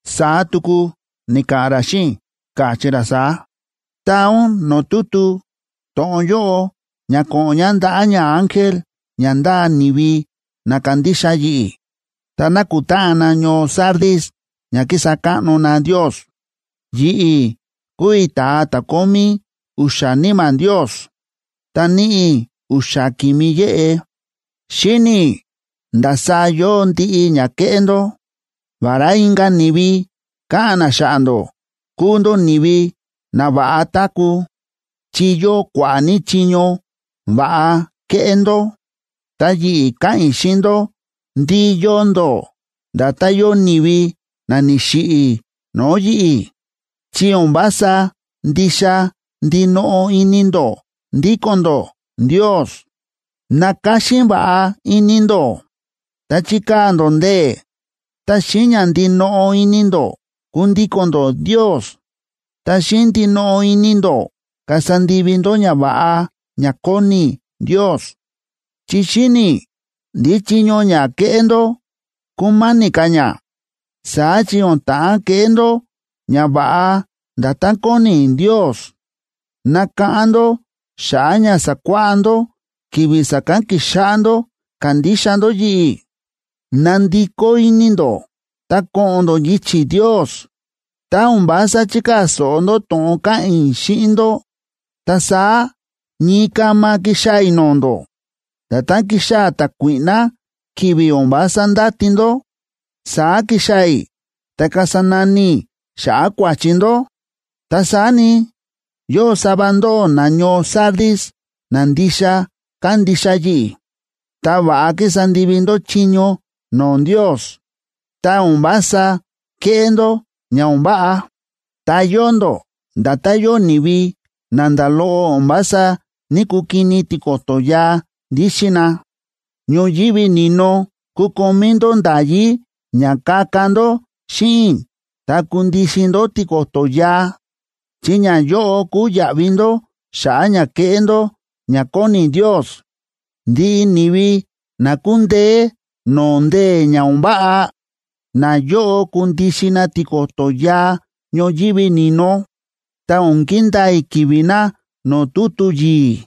Saá tuku ni̱ka̱ꞌa̱n ra xíꞌin i̱, káchí ra saá: ―Taa ún no̱o̱ tutu to̱ꞌon yóꞌo ná ko̱ꞌo̱n ña ndaꞌa̱ ñaángel ña ndáa ni̱vi na kándixa yi̱ꞌi̱ ta nákutáꞌan na ñoo Sardis ña kísa káꞌno na Ndios: “Yi̱ꞌi̱ kúu i̱ ta̱a ta̱ kómí u̱xa̱ níma̱ Ndios, ta níꞌi i̱ u̱xa̱ ki̱mi yéꞌe. Xíni̱ i̱ ndasaá yóo ndiꞌi ña ke̱ꞌé ndó. Vará inka̱ ni̱vi káꞌa̱n na xa̱ꞌa̱ ndó kúu ndó ni̱vi na va̱ꞌa táku̱, chi yóo kua̱ꞌa̱ ní chiño va̱ꞌa kéꞌé ndó, ta yi̱ꞌi̱ káꞌa̱n i̱ xíꞌin ndó ndí yóo ndó nda̱tán yóo ni̱vi na ni̱xiꞌi̱ no̱o̱ yi̱ꞌi̱, chi o̱n vása ndixa ndinoꞌo ini ndó ndíko̱n ndó Ndios. ¡Nakáxín va̱ꞌa ini ndó!, ta chikaa̱ ndó ndee̱, ta xíꞌin ña ndinoꞌo ini ndó kundíko̱n ndó Ndios, ta xíꞌin ndinoꞌo ini ndó kasa ndivi ndó ñava̱ꞌa ña kóni Ndios. Chi xíni̱ i̱ ndí chiño ña kéꞌé ndó, kúma̱ni̱ ka̱ ña, saá chi o̱n ta̱ꞌán keꞌé ndó ñava̱ꞌa nda̱tán kóni Ndios. Nakáꞌán ndó xa̱ꞌa̱ ña sa̱kuáꞌá ndó ki̱vi̱ sa̱kán ki̱xáꞌá ndó kándixa ndó yi̱ꞌi̱. Nandikó ini ndó ta ko̱ꞌo̱n ndó yichi̱ Ndios. Tá o̱n vása chikaa̱ so̱ꞌo ndó to̱ꞌon káꞌa̱n i̱ xíꞌin ndó, ta saá ñii kama kixaa̱ i̱ no̱o̱ ndó. Nda̱tán kixaa̱ ta̱kuíꞌná, ki̱vi̱ o̱n vása ndáti ndó, saá kixaa̱ i̱ ta kasa nani i̱ xa̱ꞌa̱ kua̱chi ndó. Ta saá ni, yóo sava ndóꞌó nañoo Sardis na ndixa kándixa yi̱ꞌi̱, ta va̱ꞌa kísa ndivi ndó chiño no̱o̱ Ndios, ta o̱n vása kéꞌé ndó ña o̱n váꞌa. Ta yóo ndó nda̱tán yóo ni̱vi na nda̱ loꞌo o̱n vása ní‑kukini tiko̱to̱ yaa ndíxin na. Ñoyívi ni̱no kukomí ndó nda̱yí ña kaka ndó xíꞌin i̱ ta kundixin ndó tiko̱to̱ yaa, chi ñayóꞌo kúu yaꞌvi ndó xa̱ꞌa̱ ña ke̱ꞌé ndó ña kóni Ndios. Ndiꞌi ni̱vi na kundeé no̱o̱ ndee̱ ña o̱n váꞌa, nayóꞌo kundixin na tiko̱to̱ yaa ñoyívi ni̱no, ta o̱n kindaa i̱ ki̱vi̱ na no̱o̱ tutu yi̱i̱,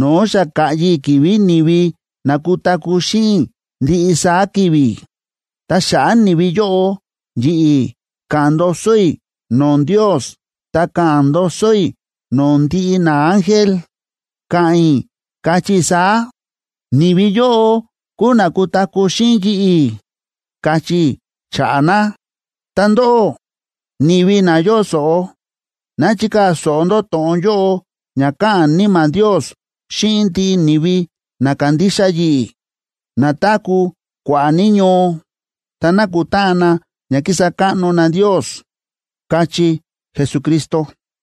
no̱o̱ xa ka̱ꞌyi i̱ ki̱vi̱ ni̱vi na kutaku̱ xíꞌin i̱ ndiꞌi saá ki̱vi̱. Ta xa̱ꞌa̱ ni̱vi yóꞌo, yi̱ꞌi̱ ka̱ꞌa̱n ndoso i̱ no̱o̱ Ndios ta ka̱ꞌa̱n ndoso i̱ no̱o̱ ndiꞌi naángel, ka̱ꞌa̱n i̱, kachí i̱ saá: Ni̱vi yóꞌo kúu na kutaku̱ xíꞌin yi̱ꞌi̱, kachí i̱ xa̱ꞌa̱ na. Ta ndóꞌó, ni̱vi na yóo so̱ꞌo, ná chikaa̱ so̱ꞌo ndó to̱ꞌon yóꞌo ña káꞌa̱n Níma̱ Ndios xíꞌin ndiꞌi ni̱vi na kándixa yi̱ꞌi̱, na táku̱ kua̱ꞌa̱ ní ñoo, ta nákutáꞌan na ña kísa káꞌno na Ndios” ―káchí Jesucristo.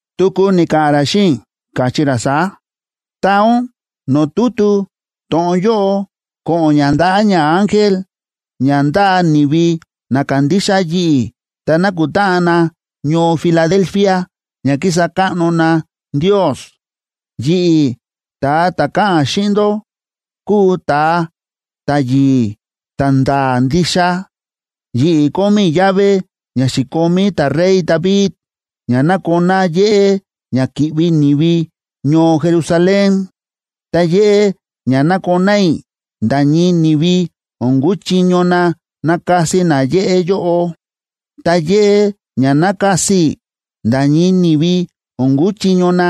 Tuku ni̱ka̱ꞌa̱n ra xíꞌin i̱, káchí ra saá: ―Taa ún no̱o̱ tutu to̱ꞌon yóꞌo ko̱ꞌo̱n ña ndaꞌa̱ ñaángel ña ndáa ni̱vi na kándixa yi̱ꞌi̱ ta nákutáꞌan na ñoo Filadelfia ña kísa káꞌno na Ndios: “Yi̱ꞌi̱, ta̱a ta̱ káꞌa̱n xíꞌin ndó, kúu ta̱a ta̱yi̱i̱ ta̱nda̱a̱ ndixa. Yi̱ꞌi̱ kómí i̱ llave ña xi̱komí ta̱rey David ña nakoná yéꞌé ña ki̱ꞌvi ni̱vi ñoo Jerusalén. Ta yéꞌé ña nakoná i̱, nda̱ ñii ni̱vi o̱n kuchiño na nakasi na yéꞌé yóꞌo. Ta yéꞌé ña nakasi i̱, nda̱ ñii ni̱vi o̱n kuchiño na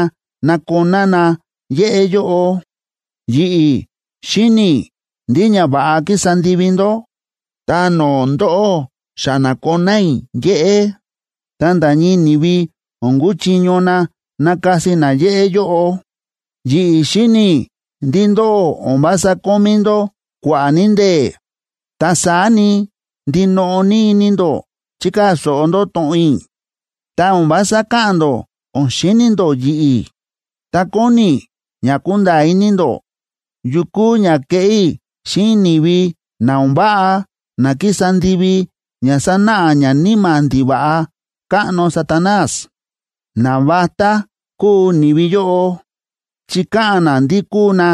nakoná na yéꞌé yóꞌo. Yi̱ꞌi̱ xíni̱ i̱ ndiꞌi ñava̱ꞌa kísa ndivi ndó. Ta no̱o̱ ndóꞌó xa na̱koná i̱ yéꞌé, ta nda̱ ñii ni̱vi o̱n kuchiño na nakasi na yéꞌé yóꞌo. Yi̱ꞌi̱ xíni̱ i̱ ndí ndóꞌó o̱n vása kómí ndó kua̱ꞌa̱ ní ndee̱, ta saá ni, ndinoꞌo ní ini ndó chi̱kaa̱ so̱ꞌo ndó to̱ꞌon i̱, ta o̱n vása káꞌa̱n ndó o̱n xíni̱ ndó yi̱ꞌi̱. Ta kóni i̱ ña kunda̱a̱ ini ndó yu kúu ña keꞌé i̱ xíꞌin ni̱vi na o̱n váꞌa na kísa ndivi ña sánáꞌa ñaníma̱ ndiva̱ꞌa káꞌno Satanás. Navatá kúu ni̱vi yóꞌo chi káꞌa̱n na ndí kúu na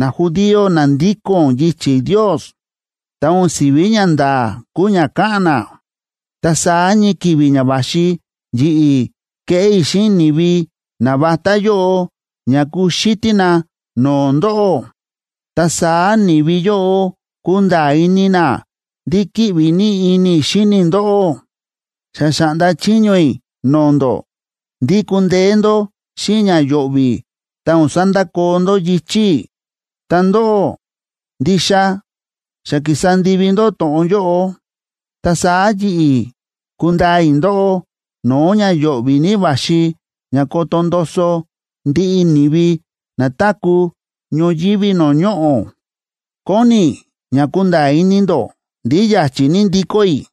najudío na ndíko̱n yichi̱ Ndios, ta o̱n si̱ví ñanda̱a̱ kúu ña káꞌa̱n na. Ta saá ñii ki̱vi̱ ña va̱xi, yi̱ꞌi̱ keꞌé i̱ xíꞌin ni̱vi navatá yóꞌo ña kuxítí na no̱o̱ ndóꞌó, ta saá ni̱vi yóꞌo kunda̱a̱ ini na ndí kíꞌvi ní ini i̱ xíni i̱ ndóꞌó. Xa xa̱ꞌnda chiño i̱ no̱o̱ ndó ndí kundeé ndó xíꞌin ña yo̱ꞌvi̱ ta o̱n sandakoo ndó yichi̱ i̱, ta ndóꞌó, ndixa xa ki̱sa ndivi ndó to̱ꞌon yóꞌo. Ta saá yi̱ꞌi̱ kundaa i̱ ndóꞌó no̱o̱ ña yo̱ꞌvi̱ ní va̱xi ña koto ndoso ndiꞌi ni̱vi na táku̱ ñoyívi no̱o̱ ñoꞌo̱. Kóni i̱ ña kunda̱a̱ ini ndó ndí ya̱chi̱ ní ndikó i̱.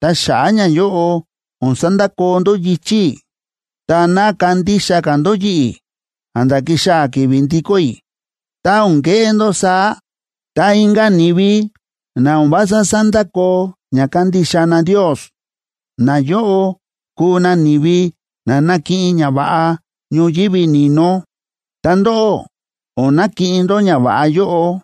Ta xa̱ꞌa̱ ñayóꞌo o̱n sandakoo ndó yichi̱ i̱ ta ná kandixa ka̱ ndó yi̱ꞌi̱ a̱nda̱ kixaa̱ ki̱vi̱ ndikó i̱. Tá o̱n keꞌé ndó saá, ta inka̱ ni̱vi na o̱n vása sándakoo ña kándixa na Ndios, nayóꞌo kuu na ni̱vi na nakiꞌin ñava̱ꞌa ñoyívi ni̱no, ta ndóꞌó o̱n nakiꞌin ndó ñava̱ꞌa yóꞌo.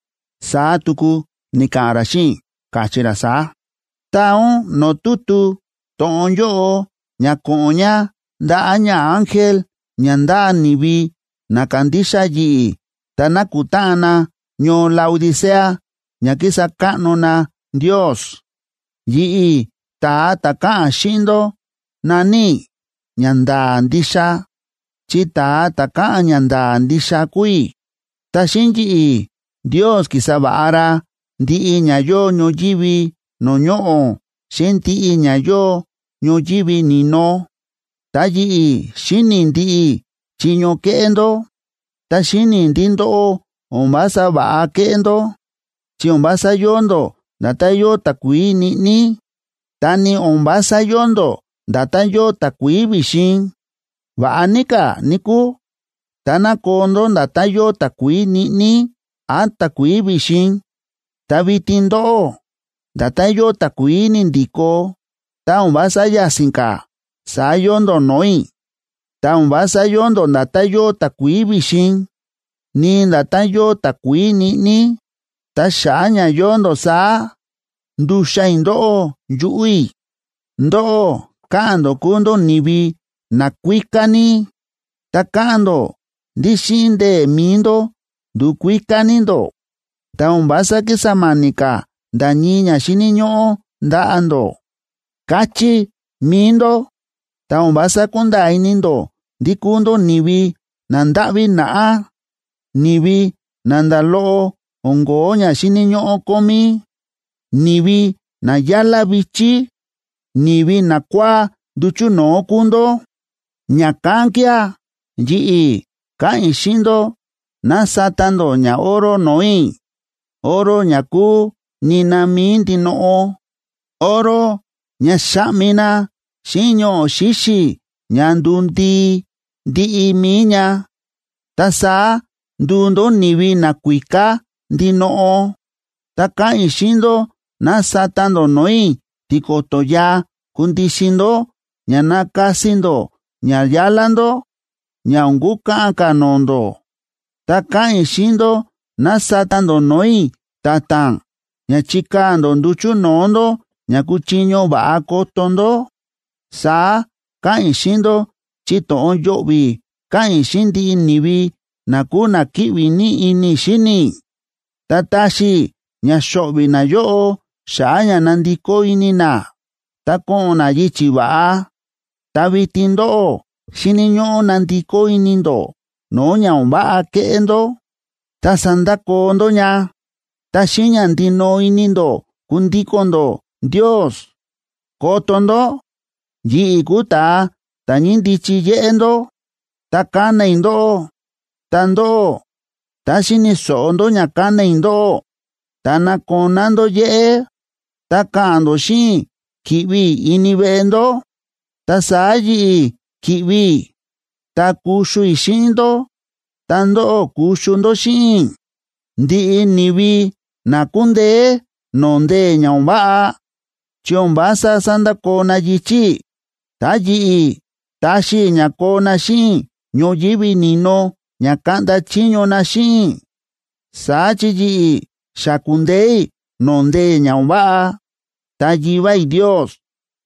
Saá tuku ni̱ka̱ꞌa̱n ra xíꞌin i̱, káchí ra saá: ―Taa ún no̱o̱ tutu to̱ꞌon yóꞌo ña ko̱ꞌo̱n ña ndaꞌa̱ ñaángel ña ndáa ni̱vi na kándixa yi̱ꞌi̱ ta nákutáꞌan na ñoo Laodicea ña kísa káꞌno na Ndios: Yi̱ꞌi̱, ta̱a ta̱ káꞌa̱n xíꞌin ndó, na̱ní i̱ Ñanda̱a̱ Ndixa, chi ta̱a ta̱ káꞌa̱n ñanda̱a̱ ndixa kúu i̱, ta xíꞌin yi̱ꞌi̱ Ndios ki̱sa va̱ꞌa ra ndiꞌi ña yóo ñoyívi no̱o̱ ñoꞌo̱ xíꞌin ndiꞌi ña yóo ñoyívi ni̱no. Ta yi̱ꞌi̱ xíni̱ i̱ ndiꞌi chiño kéꞌé ndó. Ta xíni̱ i̱ ndí ndóꞌó o̱n vása va̱ꞌa kéꞌé ndó, chi o̱n vása yóo ndó nda̱tán yóo takuií ñiꞌní, ta ni o̱n vása yóo ndó nda̱tán yóo takuií vi̱xin. ¡Va̱ꞌa ní ka̱, níkúu, táná koo ndó nda̱tán yóo takuií ñiꞌní án takuií vi̱xin!a Ta vitin ndóꞌó, nda̱tán yóo takuií ni̱ndi̱ko, tá o̱n vása ya̱si̱n ka̱, saá yóo ndó no̱o̱ i̱. Ta o̱n vása yóo ndó nda̱tán yóo takuií vi̱xin, ni nda̱tán yóo takuií ñiꞌní. Ta xa̱ꞌa̱ ña yóo ndó saá, nduxan i̱ ndóꞌó yuꞌu̱ i̱. Ndóꞌó káꞌa̱n ndó kúu ndó ni̱vi nakuíká ní, ta káꞌa̱n ndó ndí xíꞌin ndee̱ mi̱i ndó ndu̱kuíká ní ndó, ta o̱n vása kísa ma̱ni̱ ka̱ nda̱ ñii ña xíni̱ ñóꞌó ndaꞌa̱ ndó, káchí mi̱i ndó. Ta o̱n vása kúnda̱a̱ ini ndó ndí kúu ndó ni̱vi nandáꞌví naꞌá, ni̱vi na nda̱ loꞌo o̱n ko̱ó ña xíni̱ ñóꞌó kómí, ni̱vi na yálá vi̱chí, ni̱vi nakua̱á nduchu̱ no̱o̱ kúu ndó. Ña̱kán kía̱ yi̱ꞌi̱ káꞌa̱n i̱ xíꞌin ndó ná sata ndó ñaoro no̱o̱ i̱, oro ña kúu nina mi̱i ndinoꞌo, oro ña xa̱ꞌmi na xíꞌin ñoꞌo̱ xíxi̱ ña nduu ndii ndiꞌi mi̱i ña. Ta saá nduu ndó ni̱vi nakuíká ndinoꞌo. Ta káꞌa̱n i̱ xíꞌin ndó ná sata ndó no̱o̱ i̱ tiko̱to̱ yaa kundixin ndó ña nakasi ndó ña yálá ndó ña o̱n kukaꞌan ka̱ no̱o̱ ndó. Ta káꞌa̱n i̱ xíꞌin ndó ná sata ndó no̱o̱ i̱ ta̱ta̱n ña chikaa̱ ndó nduchu̱ no̱o̱ ndó ña kuchiño va̱ꞌa koto ndó. Saá káꞌa̱n i̱ xíꞌin ndó chi to̱ꞌon yo̱ꞌvi̱ káꞌa̱n i̱ xíꞌin ndiꞌi ni̱vi na kúu na kíꞌvi ní ini i̱ xíni i̱, ta taxi i̱ ña xo̱ꞌvi̱ nayóꞌo xa̱ꞌa̱ ña nandikó ini na ta ko̱ꞌo̱n na yichi̱ va̱ꞌa. Ta vitin ndóꞌó, xíni̱ ñóꞌó nandikó ini ndó no̱o̱ ña o̱n váꞌa kéꞌé ndó, ta sandakoo ndó ña. Ta xíꞌin ña ndinoꞌo ini ndó kundíko̱n ndó Ndios. ¡Koto ndó! Yi̱ꞌi̱ kúu ta̱a ta̱ ñíndichi yéꞌé ndó, ta kána i̱ ndóꞌó. Ta ndóꞌó, tá xíni̱ so̱ꞌo ndó ña kána i̱ ndóꞌó, ta nakoná ndó yéꞌé, ta ka̱ꞌa̱n ndó xíꞌin i̱ ki̱ꞌvi i̱ ini veꞌe ndó, ta saá yi̱ꞌi̱ ki̱ꞌvi i̱, ta kuxu i̱ xíꞌin ndó, ta ndóꞌó kuxu ndó xíꞌin i̱. Ndiꞌi ni̱vi na kundeé no̱o̱ ndee̱ ña o̱n váꞌa, chi o̱n vása sandakoo na yichi̱ i̱, ta yi̱ꞌi̱ taxi i̱ ña koo na xíꞌin i̱ ñoyívi ni̱no ña kaꞌnda chiño na xíꞌin i̱. Saá chi yi̱ꞌi̱ xa ku̱ndeé i̱ no̱o̱ ndee̱ ña o̱n váꞌa, ta Yivá i̱ Ndios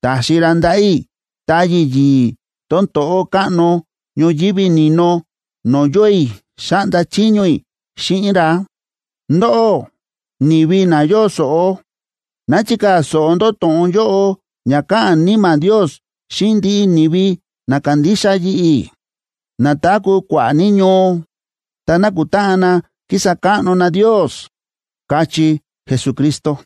ta̱xi ra ndaꞌa̱ i̱ táyi̱ yi̱i̱ tón to̱ꞌó káꞌno ñoyívi ni̱no no̱o̱ yóo i̱ xáꞌnda chiño i̱ xíꞌin ra. Ndóꞌó, ni̱vi na yóo so̱ꞌo, ná chikaa̱ so̱ꞌo ndó to̱ꞌon yóꞌo ña káꞌa̱n Níma̱ Ndios xíꞌin ndiꞌi ni̱vi na kándixa yi̱ꞌi̱, na táku̱ kua̱ꞌa̱ ní ñoo, ta nákutáꞌan na kísa káꞌno na Ndios” ―káchí Jesucristo.